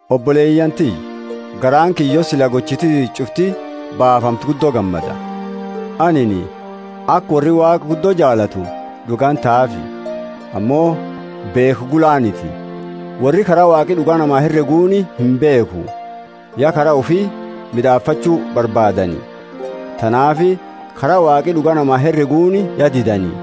Oboleyaani tiyya, garaani kiyya yo sila gochiti tiyya ch'ufti baafamte guddo gammada! Anini aka worri Waaqa guddo jaalatu d'uga intahaafi. Ammo beekha gulaaniti. Worri kara Waaqi d'uga namaa hereguuni imbeekhu, ya kara ufi mid'aafachu barbaadani; tanaafi kara Waaqi d'uga namaa hereguuni ya didani.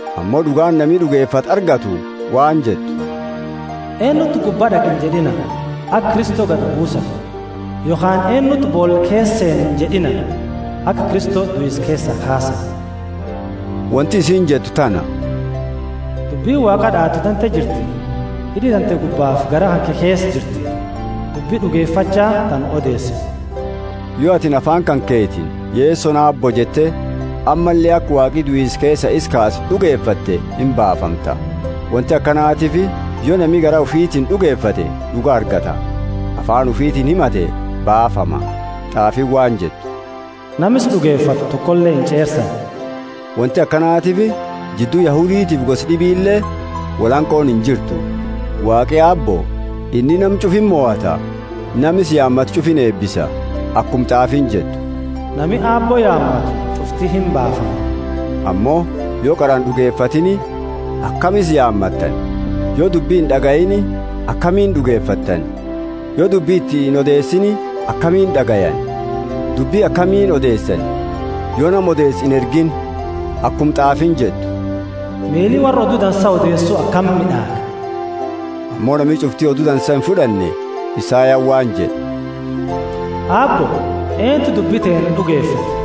Ammo d'ugaani nami d'ugefate argattu waan jettu, eennuti gubba d'aqa injed'ina (aka Kristo gadi buusani). Yokhaani eennuti boola keesa seena injed'ina (aka Kristo duisa keesa kaasani). Wonti isiini jettu tana, Dubbini Waaqa d'aatu tante jirti, hid'i tante gubbafi garaa kanke keesa jirti, dubbi d'ugefacha ta nu odeesinu. Yo atini afaani kanketiini, Yesoni Aabbo jette, ammalle aka Waaqi duisa keesaa isa kaase d'ugefatte imbaafamta. Wonti akanatiifi yo nami garaa ufitiini d'ugefate d'uga argata, afaani ufitiini himate baafama. T'aafiini waan jettu, Nama isa d'ugefatu tokole inch'eersani. Wonti akanatiifi jiddu Yahuditiifi gosa d'ibile wolhanqooni injirtu; Waaqi Aabbo, inni nama ch'ufa imohata, nama isa yaamatu ch'ufa ineebisa. Akuma t'aafiini jettu, Nami Aabbo yaamatu ch'ufti imbaafama. Ammo yo qara ind'ugefatiini, akami isa yaamatani? Yo dubbi ind'agayiini, akamiini d'ugefatani? Yo dubbi iti inodeesiini akamiini d'agayani? Dubbi akamiini odeesani yo nama odeesu inergiini? Akuma t'aafiini jettu, Miili worra odu dansa odeesu akami mid'aaga! Ammo nami ch'ufti Odu Dansa imfud'anne. Isayani waan jed'e, Aabbo, eentu dubbi teenna d'ugefate?